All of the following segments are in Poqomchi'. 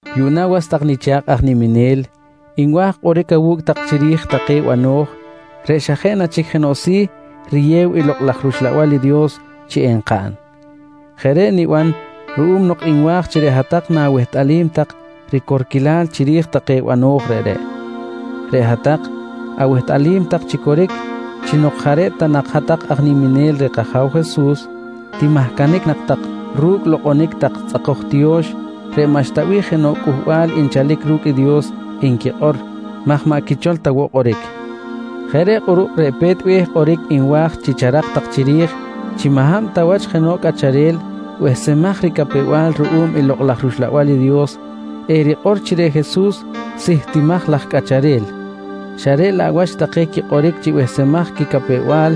Yuꞌna was tak nicha̱kꞌ aj niminel, nwa̱j kꞌoric awu̱cꞌ tak chiri̱j take bano̱j reꞌ xa jeꞌ na chic jenoꞌ si̱ riyew i Lokꞌ laj rUxlabal i Dios chi enkaꞌn. Jeꞌ reꞌ niban ruꞌum nok nwa̱j chi reꞌ hat-tak na̱wehtꞌalim tak ricorquilal chiri̱j take banoj reꞌreꞌ. Reꞌ hat-tak awehtꞌalim tak chi coric chi nok jaꞌ reꞌ ta nak hat-tak aj niminel reh kAja̱w Jesus, timahcanic nak tak ru̱cꞌ lokꞌonic tak tzꞌakoj tiyo̱x reꞌ maꞌxta bih jenoꞌ cꞌuhbal nchalic ru̱cꞌ i Dios nquikꞌor maj maꞌ quichol ta woꞌ kꞌoric. Jeꞌ reꞌ kꞌuruꞌ reꞌ pe̱t be̱h kꞌoric nwa̱j chi charak tak chiri̱j chi maꞌ hab ta wach jenoꞌ cꞌacharel behsemaj ricapew-bal ruꞌum i Lokꞌ laj rUxlabal i Dios erikꞌor chi reꞌ Jesus sihtimaj laj cꞌacharel xa reꞌ laꞌ wach take quikꞌoric chi behsemaj quicapew-bal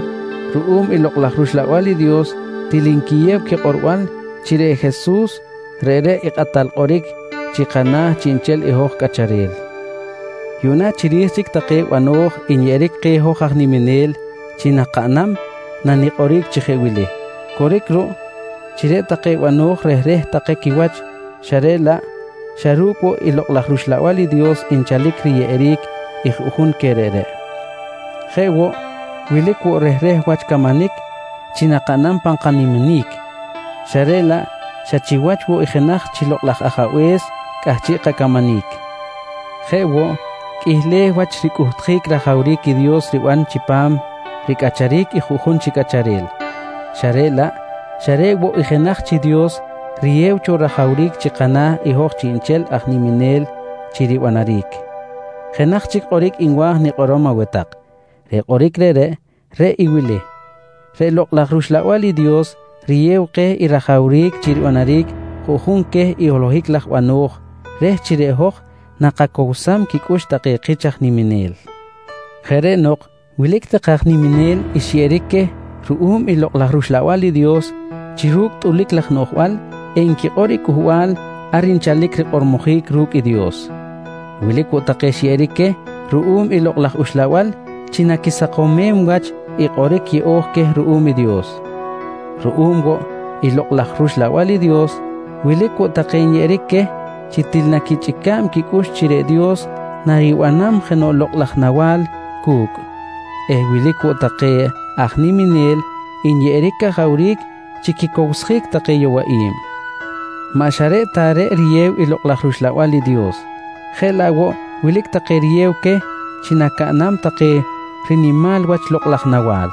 ruꞌum i Lokꞌ laj rUxlabal i Dios til nquiyew quikꞌorbal chi reꞌ Jesus, reꞌreꞌ i Kꞌatal Kꞌoric chi kana̱ chiꞌnchel i hoj cꞌacharel. Yuꞌna chiri̱j chic take bano̱j nyeꞌeric keh hoj aj niminel chi nakaꞌnam nanikꞌoric chi jeꞌ wili: Coric ruꞌ chi reꞌ take bano̱j rehreh take quiwach xa reꞌ laꞌ xa ru̱cꞌ woꞌ i Lokꞌ laj rUxlabal i Dios nchalic riyeꞌeric i juꞌjun queh reꞌreꞌ. Jeꞌ woꞌ, wilic woꞌ rehreh wach camanic chi nakaꞌnam pan kaniminic xa reꞌ laꞌ xa chiwach woꞌ i jenaj chi Lokꞌ laj Ajabe̱s cꞌahchiꞌ kacamanic. Jeꞌ woꞌ, qꞌuihleh wach ricꞌuhtjic rajawric i Dios riban chipam ricꞌacharic i juꞌjun chi cꞌacharel xa reꞌ laꞌ xa reꞌ woꞌ i jenaj chi Dios riyew cho rajawric chi kana̱ hoj chiꞌnchel aj niminel chi ribanaric. Jenaj chic kꞌoric nwa̱j nikꞌorom aweh tak, reꞌ kꞌoric reꞌreꞌ, reꞌ i wili: Reꞌ Lokꞌ laj rUxlabal i Dios riyew keh i rajawric chi ribanaric juꞌjun queh i holohic laj bano̱j reh chi reꞌ hoj nakacowsam quicꞌux take kich aj niminel. Jeꞌ reꞌ nok wilic take aj niminel xyeꞌeric queh ruꞌum i Lokꞌ laj rUxlabal i Dios chi ru̱cꞌ tꞌulic laj noꞌjbal enquikꞌor i cꞌuhbal ar nchalic rikꞌormojic ru̱cꞌ i Dios. Wilic woꞌ take xyeꞌeric queh ruꞌum i Lokꞌ laj Uxlabal chi naquisakomem wach i kꞌoric yeꞌo̱j queh ruꞌum i Dios. Ruꞌum woꞌ i Lokꞌ laj rUxlabal i Dios, wilic woꞌ take nyeꞌeric queh chi til naquichꞌica̱b quicꞌux chi reꞌ Dios naribanam jenoꞌ lokꞌ laj nawa̱l cu̱cꞌ eh wilic woꞌ take aj niminel nyeꞌeric cajawric chi quicowsjic take yowaꞌi̱b. Maꞌ xa reꞌ ta reꞌ riyew i Lokꞌ laj rUxlabal i Dios, jeꞌ laꞌ woꞌ wilic take riyew queh chi nacaꞌnam take rinimal wach lokꞌ laj nawa̱l.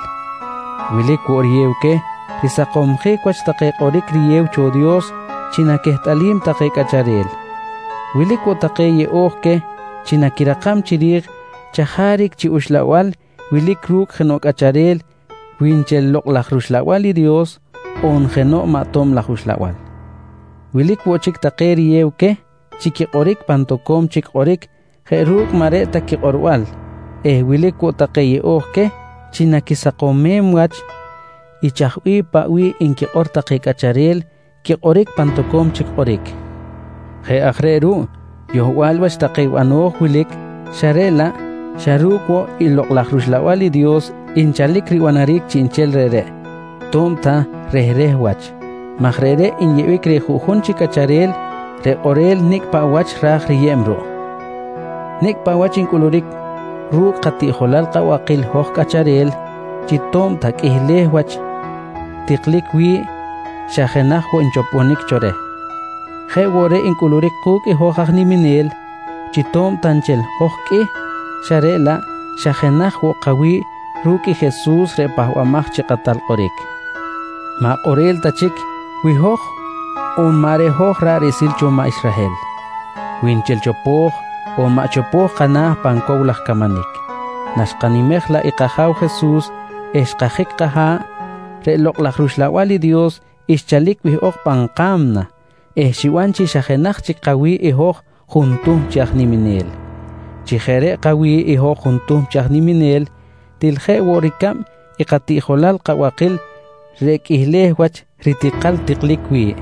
Wilic woꞌ riyew queh risakomsjic wach take kꞌoric riyew cho Dios chi naquehtꞌalim take cꞌacharel. Wilic woꞌ take yeꞌo̱j queh chi naquirakam chiri̱j chajaric chi uxlabal wilic ru̱cꞌ jenoꞌ cꞌacharel wi nchel Lokꞌ laj rUxlabal i Dios on jenoꞌ maꞌ tob laj uxlabal. Wilic woꞌ chic take riyew queh chi quikꞌoric pan tak toco̱m chic kꞌoric jeꞌ ru̱cꞌ maꞌ reꞌ ta quikꞌorbal eh wilic woꞌ take yeꞌo̱j queh chi naquisakomem wach i chaj paꞌ bih nquikꞌor take cꞌacharel quikꞌoric pan toco̱m chic kꞌoric. Jeꞌ aj reꞌ ruꞌ yohbal wach take bano̱j wilic xa reꞌ laꞌ xa ru̱cꞌ woꞌ i Lokꞌ laj rUxlabal i Dios nchalic ribanaric chiꞌnchel reꞌreꞌ to̱b ta rehreh wach maj reꞌreꞌ nyeꞌbic reh juꞌjun chi cꞌacharel reꞌ kꞌorel nicꞌ paꞌ wach ra̱j riyeb ruꞌ. Nicꞌ paꞌ wach ncꞌuluric ru̱cꞌ katiꞌjolal kabakil hoj cꞌacharel chi to̱b ta qꞌuihleh wach tiklic wi̱ꞌ xa jenaj woꞌ nchoponic cho reh, jeꞌ woꞌ reꞌ ncꞌuluric ku̱cꞌ i hoj aj niminel chi to̱b ta nchel hoj qꞌuih xa reꞌ laꞌ xa jenaj woꞌ kawi̱ꞌ ru̱cꞌ i Jesus reꞌ Pahbamaj chi Kꞌatal Kꞌoric. Maꞌ kꞌorel ta chic wi hoj on maꞌ reꞌ hoj ra̱ꞌ riꞌsil cho maꞌ Israhel, wi nchel chopo̱j on maꞌ chopo̱j kana̱ pan cow laj camanic, naxkanimej laꞌ i kAja̱w Jesus eh xkajic kaha̱ꞌ reꞌ Lokꞌ laj rUxlabal i Dios xchalic wihꞌok pan ka̱mna eh xiban chi xa jenaj chic kawi̱ꞌ i hoj juntuhm chi aj niminel. Chi jeꞌ reꞌ kawi̱ꞌ i hoj juntuhm chi aj niminel til je woꞌ ricab i katiꞌjolal kabakil reꞌ qꞌuihleh wach ritikal tiklic wi̱ꞌ,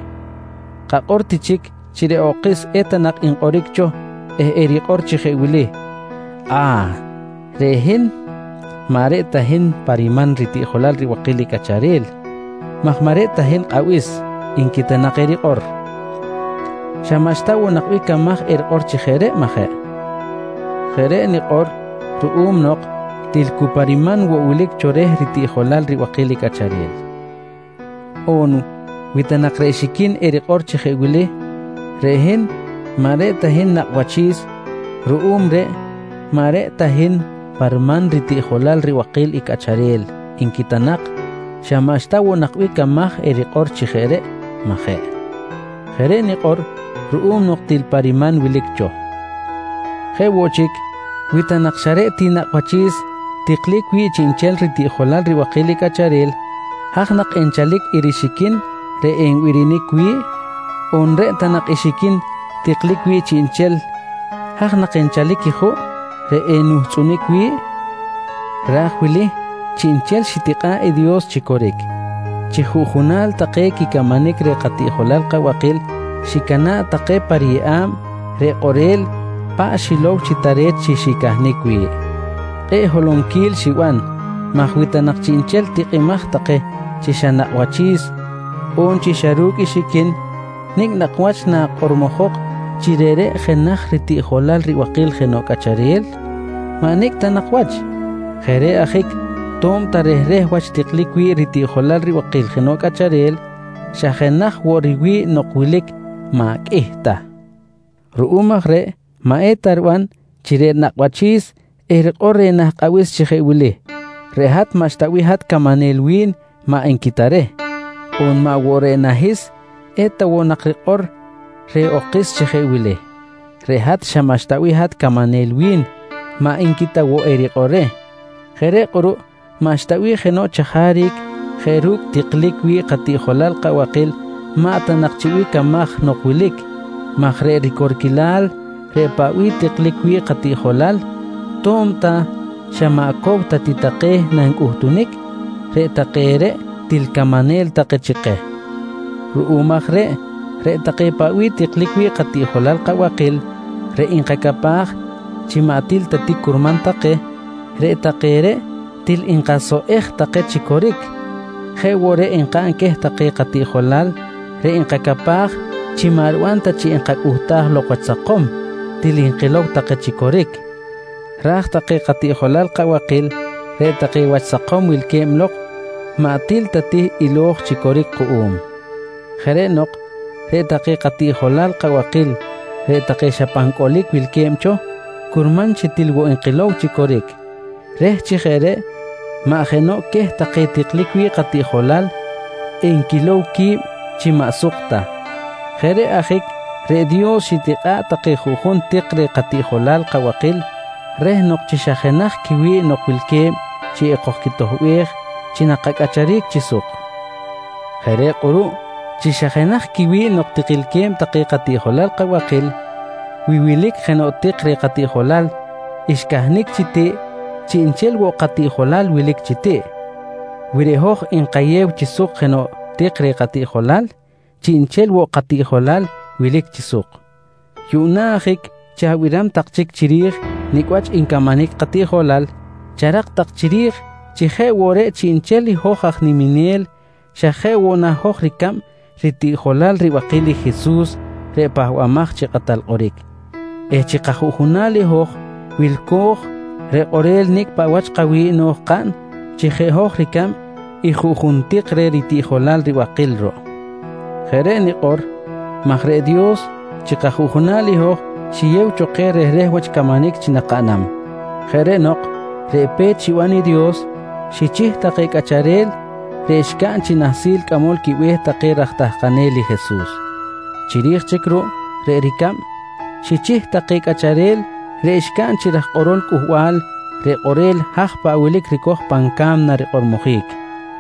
kakꞌor ti chic chi reꞌ okis eta nak nkꞌoric cho eh erikꞌor chi je wili: «A̱h! Reꞌ hin maꞌ reꞌ hin pa riman ritiꞌjojal ribakil i cꞌacharel maj maꞌ reꞌ ta hin kꞌabis, nqui ta nak erikꞌor. Xa maꞌxta woꞌ nak camaj erikꞌor chi jeꞌ reꞌ, maꞌ jeꞌ? Jeꞌ reꞌ nikꞌor ruꞌum nok til cu pa riman woꞌ wilic cho reh ritiꞌjolal ribakil i cꞌacharel. On wi ta nak reꞌ xiquin erikꞌor chi jeꞌ wili: «Reꞌ hin maꞌ reꞌ hin nakꞌ wachi̱s, ruꞌum reꞌ maꞌ reꞌ ta hin pa riman ritiꞌjolal ribakil i cꞌacharel, nqui ta nak. Xa maꞌxta woꞌ nak camaj erikꞌor chi jeꞌ reꞌ, maꞌ jeꞌ? Jeꞌ reꞌ nikꞌor ruꞌum nok til pa riman wilic cho. Jeꞌ woꞌ chic, wi ta nak xa reꞌ ti nakꞌ wachi̱s tiklic wi̱ꞌ chiꞌnchel ritiꞌjolal ribakil i cꞌacharel, haj nak enchalic i rixiquin reꞌ enbirinic wi̱ꞌ? On reꞌ ta nak i xiquin tiklic wi̱ꞌ chiꞌnchel, haj nak enchalic i juꞌ reꞌ enuhtzꞌunic wi̱ꞌ? Raj wili chiꞌnchel xitikꞌa̱ꞌ i Dios chi coric, chi juꞌjunal take quicamanic reh katiꞌjolal kabakil xicana̱ꞌ take pa riyeꞌa̱b reꞌ kꞌorel paꞌ xilow chi tare̱t chi xicahnic wi̱ꞌ. Kꞌe̱ꞌ holonquil xiban maj wi ta nak chiꞌnchel tikꞌimaj take chi xa nakꞌ wachi̱s on chi xa ru̱cꞌ i xiquin, nicꞌ nak wach nakꞌormojok chi reꞌreꞌ jenaj ritiꞌjolal ribakil jenoꞌ cꞌacharel? Maꞌ nicꞌ ta wach. Jeꞌ reꞌ ajic to̱b ta rehreh wach tiklic wi̱ꞌ ritiꞌjolal ribakil jenoꞌ cꞌacharel, xa jenaj woꞌ riwi̱ꞌ nok wilic maꞌ qꞌuih ta. Ruꞌum aj reꞌ maꞌ eta riban chi reꞌ nakꞌ wachi̱s erikꞌor reh nah kꞌabis chi jeꞌ wili: «Reꞌ hat maꞌxta bih hat camanel wi̱n, maꞌ nqui ta reh. On maꞌ woꞌ reꞌ nahis eta woꞌ nak rikꞌor reh okis chi jeꞌ wili: «Reꞌ hat xa maꞌxta bih hat camanel wi̱n, maꞌ nqui ta woꞌ erikꞌor reh. Jeꞌ reꞌ kꞌuruꞌ maꞌxta bih jenoꞌ chajaric jeꞌ ru̱cꞌ tiklic wi̱ꞌ katiꞌjolal kabakil maꞌ ta nak chi bih camaj nok wilic maj reꞌ ricorquilal reꞌ paꞌ bih tiklic wi̱ꞌ katiꞌjolal to̱b ta xa maꞌ cow ta ti take nancꞌuhtunic, reꞌ take reꞌ til camanel take chi keh. Ruꞌum aj reꞌ, reꞌ take paꞌ bih tiklic wi̱ꞌ katiꞌjolal kabakil reꞌ nkacapaj chi maꞌ til ta ti curman take, reꞌ take reꞌ til nkasoꞌej take chi coric. Jeꞌ woꞌ reꞌ nkaꞌn queh take katiꞌjolal reꞌ nkacapaj chi maꞌ riban ta chi enkacꞌuhtaj lok wach sakom, til nkilow take chi coric, raj take katiꞌjolal kabakil reꞌ take wach sakom wilque̱b lok, maꞌ til ta ti ilo̱j chi coric kuꞌum. Jeꞌ reꞌ nok reꞌ take katiꞌjolal kabakil reꞌ take xa pan cꞌolic wilque̱b cho, curman chi til woꞌ nkilow chi coric reh chi jeꞌ reꞌ maꞌ jenoꞌ queh take tiklic wi̱ꞌ katiꞌjolal enquilow qui̱b chi maꞌ suk ta. Jeꞌ reꞌ ajic, reꞌ Dios xitikꞌa̱ꞌ take juꞌjun tik reh katiꞌjolal kabakil reh nok chi xa jenaj quiwi̱ꞌ nok wilque̱b chi ekojquitoꞌbej chi nakacꞌacharic chi suk. Jeꞌ reꞌ kꞌuruꞌ chi xa jenaj quiwi̱ꞌ nok tikilque̱b take katiꞌjolal kabakil, wi wilic jenoꞌ tik reh katiꞌjolal xcahnic chi tiꞌ, chiꞌnchel woꞌ katiꞌjolal wilic chi tiꞌ. Wi reꞌ hoj nkayew chi suk jenoꞌ tik reh katiꞌjolal, chiꞌnchel woꞌ i katiꞌjolal wilic chi suk. Yuꞌna ajic chi abiram tak chic chiri̱j nicꞌ wach ncamanic katiꞌjolal, charak tak chiri̱j chi jeꞌ woꞌ reꞌ chiꞌnchel i hoj aj niminel xa jeꞌ woꞌ na hoj ricab ritiꞌjolal ribakil i Jesus reꞌ Pahbamaj chi Kꞌatal Kꞌoric eh chi kajuꞌjunal i hoj wilco̱j reꞌ kꞌorel nicꞌ paꞌ wach kawi̱ꞌ no̱j kaꞌn chi jeꞌ hoj ricab i juꞌjun tik reh ritiꞌjolal ribakil ruꞌ. Jeꞌ reꞌ nikꞌor maj reꞌ Dios chi kajuꞌjunal i hoj xiyew cho keh rehreh wach camanic chi nakaꞌnam. Jeꞌ reꞌ nok reꞌ pe̱t xiban i Dios, xichih take cꞌacharel reꞌ xcaꞌn chi nahsil cꞌamol quibe̱h take raj tahkanel i Jesus. Chiri̱j chic ruꞌ reꞌ ricab, xichih take cꞌacharel reꞌ xcaꞌn chi raj kꞌorol cꞌuhbal reꞌ kꞌorel haj paꞌ wilic ricoj pan ca̱mna rikꞌormojic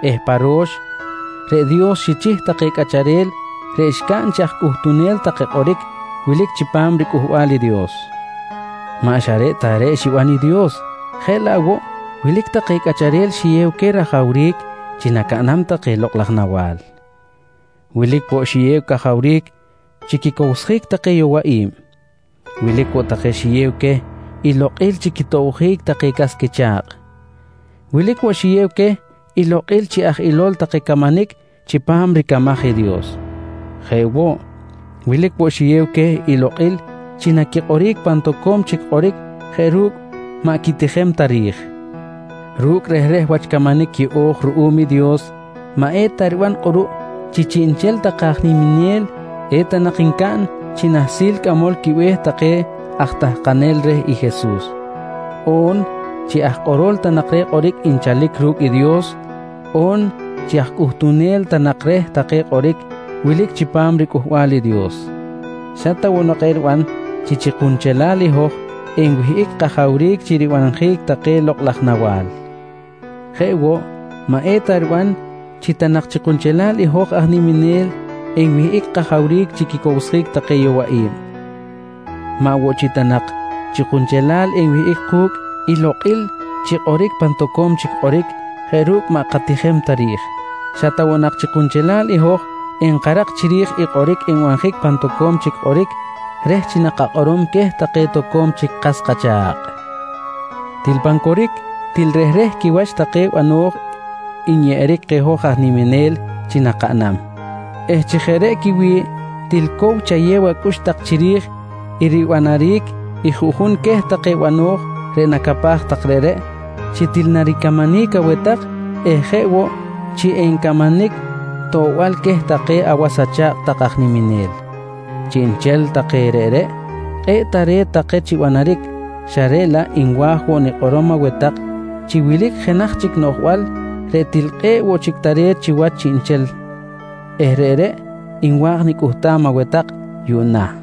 eh pa ro̱x reꞌ Dios xichih take cꞌacharel reꞌ xcaꞌn chi aj cꞌuhtunel take kꞌoric wilic chipam riCꞌuhbal i Dios. Maꞌ xa reꞌ ta reꞌ xiban i Dios jeꞌ laꞌ woꞌ wilic take cꞌacharel xiyew queh rajawric chi nacaꞌnam take lokꞌ laj nawa̱l. Wilic woꞌ xiyew cajawric chi quicowsjic take yowaꞌi̱b. Wilic woꞌ take xiyew queh i lokꞌil chi quitobjic take cas quicha̱kꞌ. Wilic woꞌ xiyew queh i lokꞌil chi aj ilol take camanic chipam ricamaj i Dios. Jeꞌ woꞌ, wilic woꞌ xiyew queh i lokꞌil chi naquikꞌoric pan toco̱m chic kꞌoric jeꞌ ru̱cꞌ maꞌ quitijem ta ri̱j. Ru̱cꞌ rehreh wach camanic yeꞌo̱j ruꞌum i Dios, maꞌ eta riban kꞌuruꞌ chi chiꞌnchel take aj niminel eta nak ncaꞌn chi nahsil cꞌamol quibe̱h take aj tahkanel reh i Jesus, on chi aj kꞌorol ta nak reh kꞌoric nchalic ru̱cꞌ i Dios on chi aj cꞌuhtunel ta nak reh take kꞌoric wilic chipam riCꞌuhbal i Dios. Xa ta nak woꞌ eriban chi chi kunchelal i hoj enwihꞌic kajawric chi ribanjic take lokꞌ laj nawa̱l. Jeꞌ woꞌ, maꞌ eta riban chi ta nak chi kunchelal i hoj aj niminel enwihꞌic kajawric chi quicowsjic take yowaꞌi̱b. Maꞌ woꞌ chi ta nak chi kunchelal enwihꞌic ku̱cꞌ i lokꞌil chi kꞌoric pan toco̱m chic kꞌoric jeꞌ ru̱cꞌ maꞌ katijem ta ri̱j. Xa ta woꞌ nak chi kunchelal i hoj enkarak chiri̱j i kꞌoric nbanjic pan toco̱m chic kꞌoric reh chi nakakꞌorom queh take toco̱m chic kas kacha̱kꞌ. Til pan coric til rehreh quiwach take bano̱j nyeꞌeric keh hoj aj niminel chi nakaꞌnam eh chi jeꞌ reꞌ quiwi̱ꞌ, til cow chayew acꞌux tak chiri̱j i ribanaric i juꞌjun queh take bano̱j reꞌ nacapaj tak reꞌreꞌ, chi til naricamanic aweh hat eh jeꞌ woꞌ chi encamanic toꞌbal queh take awas acha̱kꞌ tak aj niminel. Chiꞌnchel take reꞌreꞌ kꞌe̱ꞌ tare̱t take chi banaric xa reꞌ laꞌ nwa̱j woꞌ nikꞌorom aweh tak chi wilic jenaj chic noꞌjbal reꞌ til kꞌe̱ꞌ woꞌ chic tare̱t chiwach chiꞌnchel eh reꞌreꞌ nwa̱j nicꞌuhtam aweh tak yuꞌna.